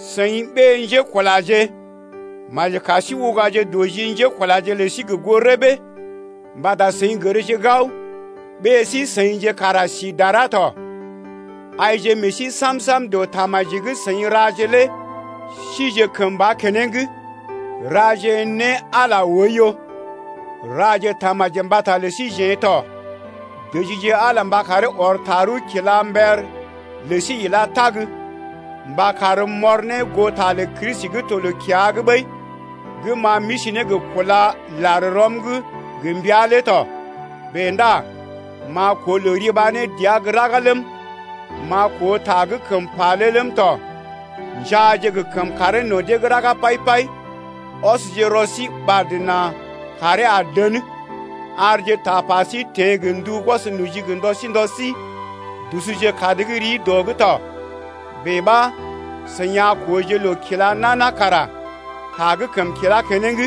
Seḭ ɓé-njékulaje, maji kar sí ugaje dɔ ji njékulaje lə sí gə goo rəbee mbata seḭ gərje gao, ɓée sí-seḭje kara si dara tɔ. Aije meḛ sí sam-sam dɔ tamaji gə́ seḭ raje lé sije kəmba keneŋ, raje ne Ala oiyo. Raje tamaji mbata lə síjeḛ tɔ, dəjije Ala mba karee ɔr tarəw kila mber lə sí ilá tag, mba karm m’ɔr ne goo ta lə Kristi gə́ to loo-kiya’g ɓəi gə́ ma m’isi ne gə kúla lar rɔm’g gə mbəa lé tɔ. Bèe ndá m’a koo loo riba ne dəa gə́ raga ləm, m’a koo ta gə́ kəm pa lé ləm tɔ. Njaaje gə kəmkàree no̰ dee’g raga pai-pai, ɔsje rɔ sí ɓad nà kàree a dən. Arje tapa sí teḛ gə ndu gwɔs noji gə ndɔ sí ndɔ sí, dusuje kad gə́ rii dɔ’g tɔ, bèe ɓa seḭ a kooje loo kila nana kara ta gə́ kəm kilá keneŋ.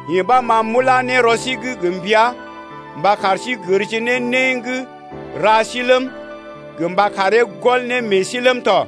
Yee ɓa ma m’ulá ne rɔ sí’g gə mbəa mba kar sí gərje ne né gə́ ra sí ləm, gə mba karee gɔl ne meḛ sí ləm tɔ.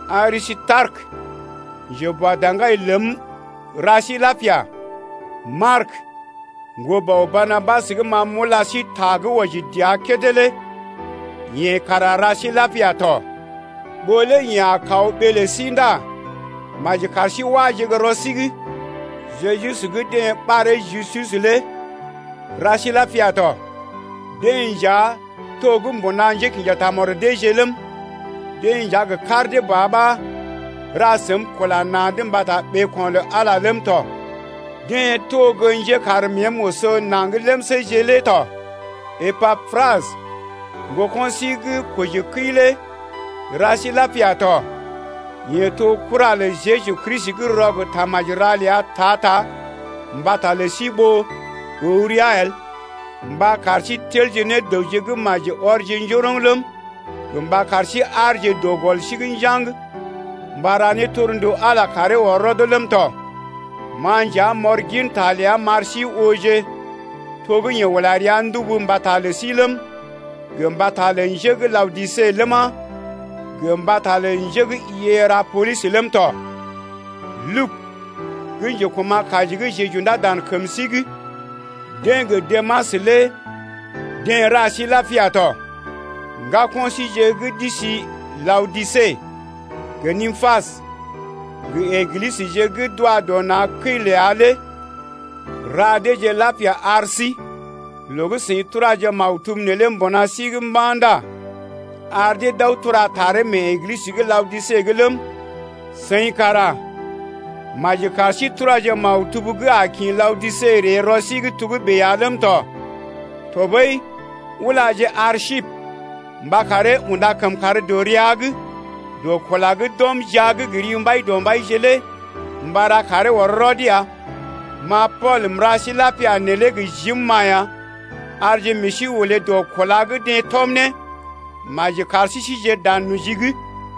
Arisitarekə, njeboadaŋgai ləm ra sí lapia. Mark, ŋgolə bɔ Barnabas gə́ ma m’ula sí ta gə́ wɔji dəa kédé lé yeḛ kara ra sí lapia tɔ. Ɓó lé yeḛ a kaw ɓee lə sí ndá maji kar sí wáje gə́ rɔ sí’g Jeju gə́ deḛ ɓaree Justus lé ra sí lapia tɔ. Deḛ nja to mbuna njékḭja tamɔd deeje ləm, deḛ nja gə kar dee ba ɓa ra səm kula na̰’d mbata ɓeeko̰ lə Ala ləm tɔ, deḛ to gə́ njekar məəm oso naŋg ləmséje lé tɔ. Epapras, ŋgoko̰ sí gə́ kojikəi lé ra sí lapia tɔ. Yeḛ to kura lə Jeju Kristi gə́ rɔ gə tamaji-ra ləa ta-ta mbata lə sí ɓó əw rəa el mba kar sí telje ne dəwje gə́ maji ɔrje njoroŋ ləm, gə mba kar sí aarje dɔ gɔl sí’g njaŋg mba ra ne torndu Ala karee ɔr rɔd ləm tɔ. Ma nja m’ɔr goo ta ləa m’ar sí ooje to gə́ yeḛ ula rəa ndubu mbata lə sí ləm, gə mbata lə njé gə́ Laodise ləma, gə mbata lə njé gə́ Hierapolis ləm tɔ. Lugu gə́ njekuma̰-kaji gə́ jeḛ j’undá dan kəm sí’g deḛ gə Demas lé deḛ ra sí lapia tɔ. Ŋgako̰ síje gə́ d’isi Laodise, gə Nympas, gə Eglisəje gə́ d’wa dɔ na̰ kəi ləa lé ra deeje lapia ar síje. Loo gə́ seḭ turaje maktub neelé mbuna sí’g mba̰ ndá ar dee d’aw tura taree mee Eglisə gə́ Laodise’g ləm, seḭ kara maji kar sí turaje maktub gə́ a kḭ Laodise ree rɔ sí’g togə́bè ya ləm tɔ. Tɔɓəi ulaje Arsipə mba karee unda kəmkàr dɔ rəa’g dɔ kula gə́ d’ɔm jia’g gə ri Mbaidɔmbaije lé mba ra karee ɔr rɔd ya. Ma Pool m’ra sí lapia neelé gə jim-ma ya. Arje meḛ sí olé dɔ kúla gə́ deḛ tɔm ne. Maji kar sí sije dan noji’g ya!